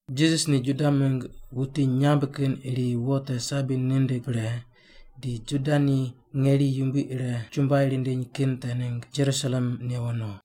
Jisas ni Juda mingg wuti nyamb kin iri wo te sabi nindig pre, di Juda ni ngeri yumbui ire chumbuai rindiny kin te ningg Jerusalem newo no.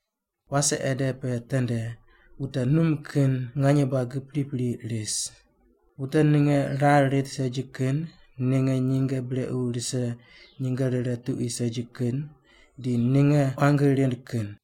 Wase ede pe tende wute num kin nganye buagi pripri ris: wute ninge rar rit segi kin, ninge nyinge brequ rise nyinge rire tuqui segi kin, di ninge quangi rind kin.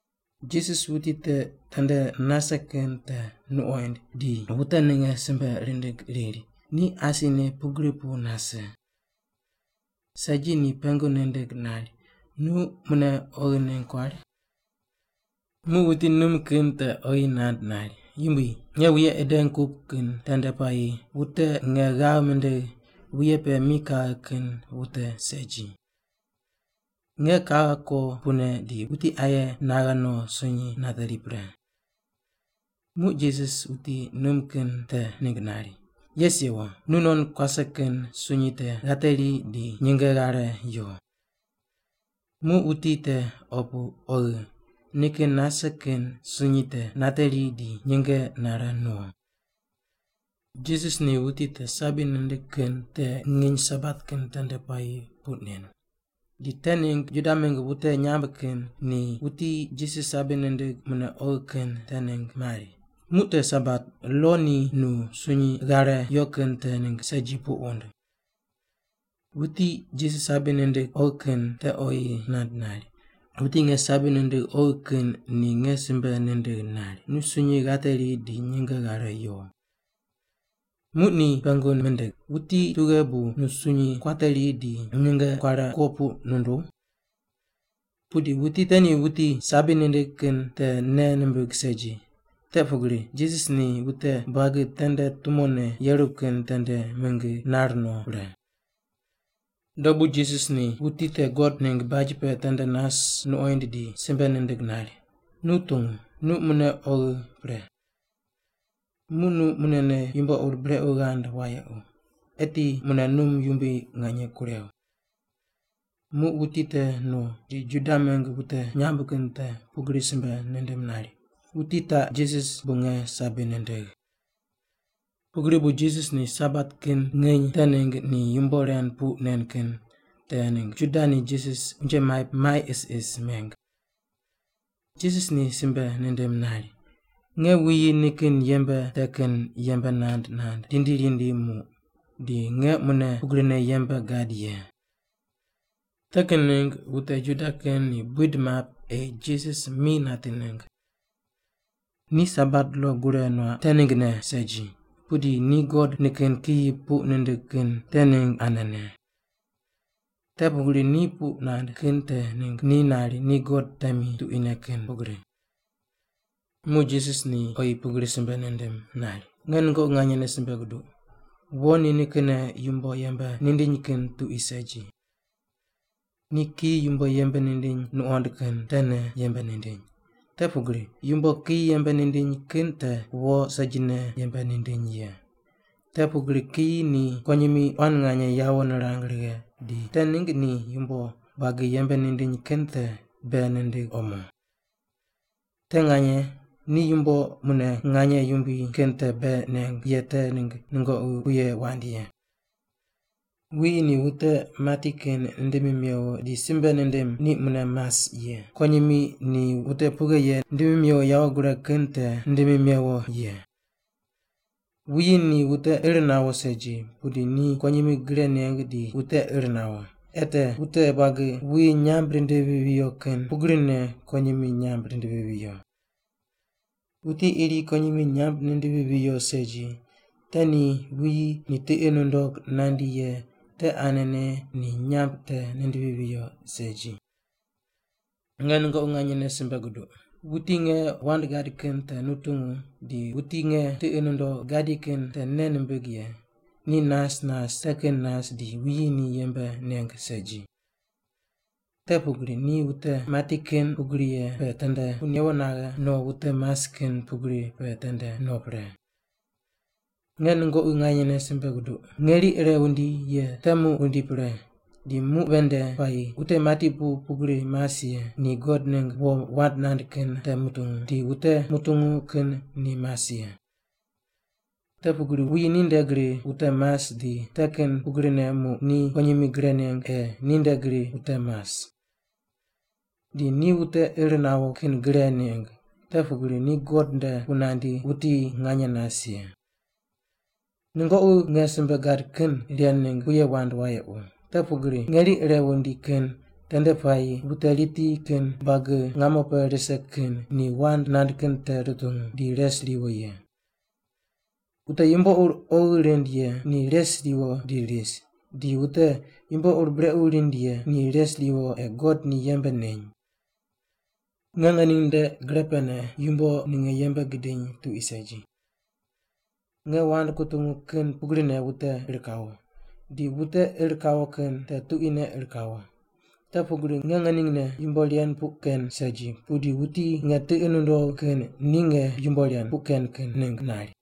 Jisas wuti te tende nase kin te nuqoind di wute ninge simbe rindig riri ni asine pugri pu nase. Segi ni pengu nindig nari, “Nu mune oghi ningg kuari?” Muq wuti num kin te oyi nand nari, “Yumbui, nge wuye ideng kup kin tende puayi wute nge ghav mindigh wuye pe mi kaghe kin wute segi. Nge kaghe ko pune di wuti aye naghe no sunyi nateri pre.” Muq Jisas wuti num kin te ningg nari, “Yes yewo! Nunon kuase kin sunyi te ghateri di nyinge ghare yo.” Muq wuti te opu oghi, nikin nase kin sunyi te nateri di nyinge nare no. Jisas ni wuti te sabi nindig kin te nginy Sabat kin tende puayi puq nen, di te ningg Juda mingg wute nyamb kin ni wuti te Jisas sabi nindig mune oghi kin te ningg mari, “Muq te Sabat, lo ni nu sunyi ghare yo kin te ningg segi puq wund.” Wuti Jisas sabi nindig oghi kin te oyi nand nari, “Wuti nge sabi nindigh oghi kin ni nge simbe nindigh nari, ‘Nu sunyi ghateri di nyinge ghare yo’.” Muq ni pengu mindig, “Wuti tughe bu nu sunyi kuateri di nyinge kuare kuo puq nunduw?” Pudi wuti te ni wuti sabi nindig kin te nei nimbig segi, te pugri Jisas ni wute buagi tende tumone yeru kin tende mingi nar no pre. Dobu Jisas ni wuti te God ningg baj pe tende nas nuqoind di simbe nindig nari, “Nu tungu, nu mune oghi pre. Muq nu munene yumbo ur brequ ghand wayequ, eti mune num yumbui nganye kurew.” Muq wuti te no, di Juda mingg wute nyamb kin te pugri simbe nindim nari, “Wuti taq Jisas bu nge sabi nindigh.” Pugri bu Jisas ni Sabat kin nginy te ningg ni yumbo ren puq nen kin te ningg Juda ni Jisas unje maip mai isis meng. Jisas ni simbe nindim nari, “Nge wuyi nikin yembe te kin yembe nand nand rindi rindi muq, di nge mune pugrine yembe gad ye.” Te kin ningg wute Juda kin ni buid map ei Jisas mi nati ningg. Ni Sabat lo gure nuaq kin te ninggne segi, pudi ni God nikin kiyi puq nindig kin te ningg anene. Te pugri ni puq nand kin te ningg ni nari ni God temi tuquine kin pugri. Muq Jisas ni oyi pugri simbe nindim nari, “Nge nungoqi nganyene simbe guduq, wo ni nikinne yumbo yembe nindiny kin tuqui segi. Ni kiyi yumbo yembe nindiny nuqond kin tene yembe nindiny, te pugri yumbo kiyi yembe nindiny kin te wo segine yembe nindiny ye. Te pugri kiyi ni kuwonyimi quan nganye yawo nirang righe, di te ningg ni yumbo buagi yembe nindiny kin te bei nindig omo. Te nganye, ni yumbo mune nganye yumbui kin te bei neng ye te ningg nungoqi puye wand ye. Wuyi ni wute mati kin nindimi mewo di simbe nindim ni mune mas ye, pugrine kuwonyimi ni wute pughe ye nindimi mewo yawo gureg kin te nindimi mewo ye. Wuyi ni wute ir nawo segi, pudi ni kuwonyimi gre neng di wute ir nawo, ei te wute buagi wuyi nyamb rindivi viyo kin pugrine kuwonyimi nyamb rindivi viyo. Wuti iri kuwonyimi nyamb nindivi viyo segi, te ni wuyi ni tiqi nundog nandi ye te anene ni nyamb te nindivi viyo segi. “Nge nungoqi nganyene simbe guduq, wuti nge wand gad kin te nutungu di wuti nge tiqi nundogh gadi kin te nei nimbig ye, ni nas nas te kin nas di wuyi ni yembe neng segi. Te pugri ni wute mati kin pugri ye pe tende pu newo naghe no wute mas kin pugri pe tende no pre. Nge nungoqi nganyene simbe guduq, ngeri ire wundi ye te muq wundi pre di muq ven nde puayi wute mati pu pugri mas ye ni God ningg wo wand nand kin te mutungu, di wute mutungu kin ni mas ye. Te pugri wuyi ni nde gri wute mas di te kin pugrine muq ni kuwonyimi gre neng ei ninde gri wute mas. Di ni wute ir nawo kin gre neng, te pugri ni God nde pu nandi wuti nganye nas ye. “Nungoqi nge simbe gad kin ren ningg puye wand wayequ, te pugri ngeri ire wundi kin tende puayi wute riti kin buagi ngamo pe rise kin ni wand nand kin te rutungu, di res riwo ye. Wute yumbo ur oghi rind ye ni res riwo di ris, di wute yumbo ur brequ rind ye ni res riwo ei God ni yembe neny. Nge ngening nde gre pene yumbo ninge yembe gidiny tuqui segi. Nge wand kutungu kin pugrine wute ir kawo, di wute ir kawo kin te tuquine ir kawo, te pugri nge ngeningne yumbo ren puq ken segi, pudi wuti nge tiqi nundogh kin ni nge yumbo ren puq ken ningg nari.”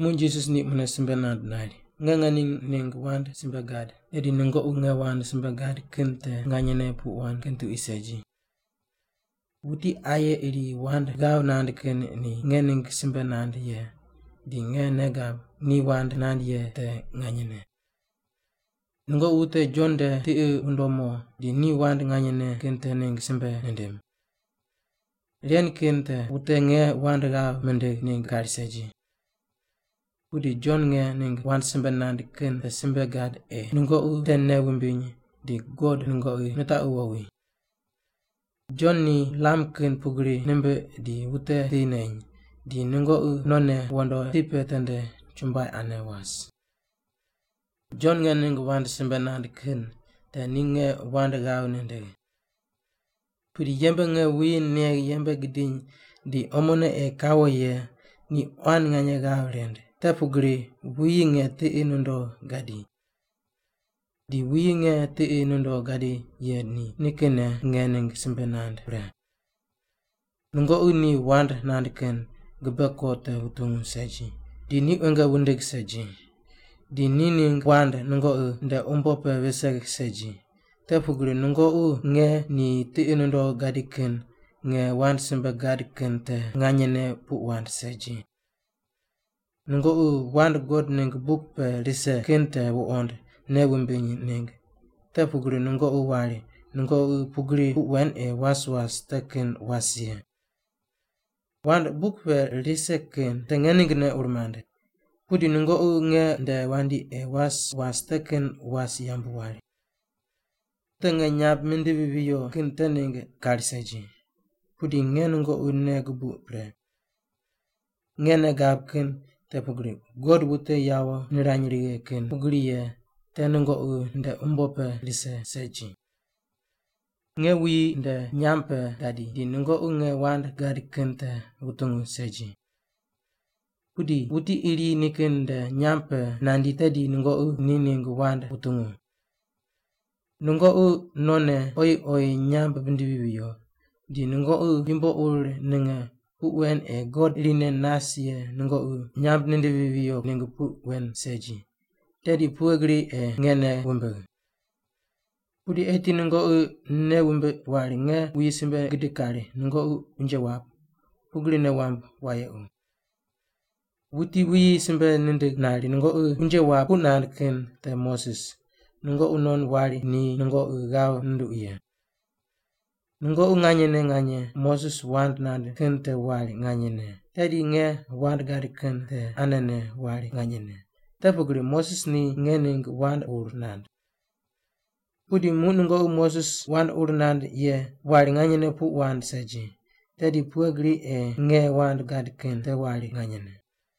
Muq Jisas ni mune simbe nand nari, “Nge ngening ningg wand simbe gad, tedi nungoqi nge wand simbe gad kin te nganyene puq wand kin tuqui segi. Wuti aye iri wand ghav nand kin ni nge ningg simbe nand ye, di nge nei gab ni wand nand ye te nganyene. “Nungoqi wute Jon nde tiqi wundom mo, di ni wand nganyene kin te ningg simbe nindim. Ren kin te wute nge wand ghav mindigh ningg kari segi. Pudi Jon nge ningg wand simbe nand kin te simbe gad ei nungoqi te nei wumbiny di God nungoqi nitaqu wowi. Jon ni lam kin pugri nimbiq di wute ti neny, di nungoqi nonne wondo ti pe tende chumbuai ane was. “Jon nge ningg wand simbe nand kin te ni nge wand ghav nindigh. Pudi yembe nge wuyi negh yembe gidiny di omone ei kawo ye ni quan nganye ghav rind, te pugri wuyi nge tiqi nundogh gadi. Di wuyi nge tiqi nundogh gadi ye ni nikinne nge ningg simbe nand pre. Nungoqi ni wand nand kin gibe ko te wuntungu segi, di ni quenge wundig segi, di ni ningg wand nungoqi nde umbo pe vise segi, te pugri nungoqi nge ni tiqi nundogh gadi kin nge wand simbe gad kin te nganyene puq wand segi. Nungoqi wand God ningg buk pe rise kin te wuqond nei wumbiny ningg, te pugri nungoqi wari nungoqi pugri puq wen ei was was te kin was ye. Wand buk pe rise kin te nge ninggne ur mand, pudi nungoqi nge nde wandi ei was was te kin was yambu wari. “Wute nge nyamb mindivi viyo kin te ningg kari segi, pudi nge nungoqi nei gubuq pre. Nge nei gab kin te pugri God wute yawo nirany righe kin pugri ye te nungoqi nde umbo pe rise segi. Nge wuyi nde nyamb pe gadi, di nungoqi nge wand gad kin te wutungu segi. Pudi wuti iri nikin nde nyamb pe nandi tedi nungoqi ni ningg wand wutungu. Nungoqi nonne oyi oyi nyamb wundivi viyo, di nungoqi yumbo ur ninge puq wen ei God irine nas ye nungoqi nyamb nindivi viyo ningg puq wen segi, tedi pughe gri ei nge nei wumbigh? “Pudi eti nungoqi nei wumbiq wari nge wuyi simbe gidig kari nungoqi unje wap, pugri nei wamb wayequ. Wuti wuyi simbe nindig nari nungoqi unje wap puq nand kin te Moses, nungoqi non wari ni nungoqi ghav nunduq ye. Nungoqi nganyene nganye Moses wand nand kin te wari nganyene, tedi nge wand gad kin te anene wari nganyene, te pugri Moses ni nge ningg wand ur nand. Pudi muq nungoqi Moses wand ur nand ye te wari nganyene puq wand segi, tedi pughe gri ei nge wand gad kin te wari nganyene?”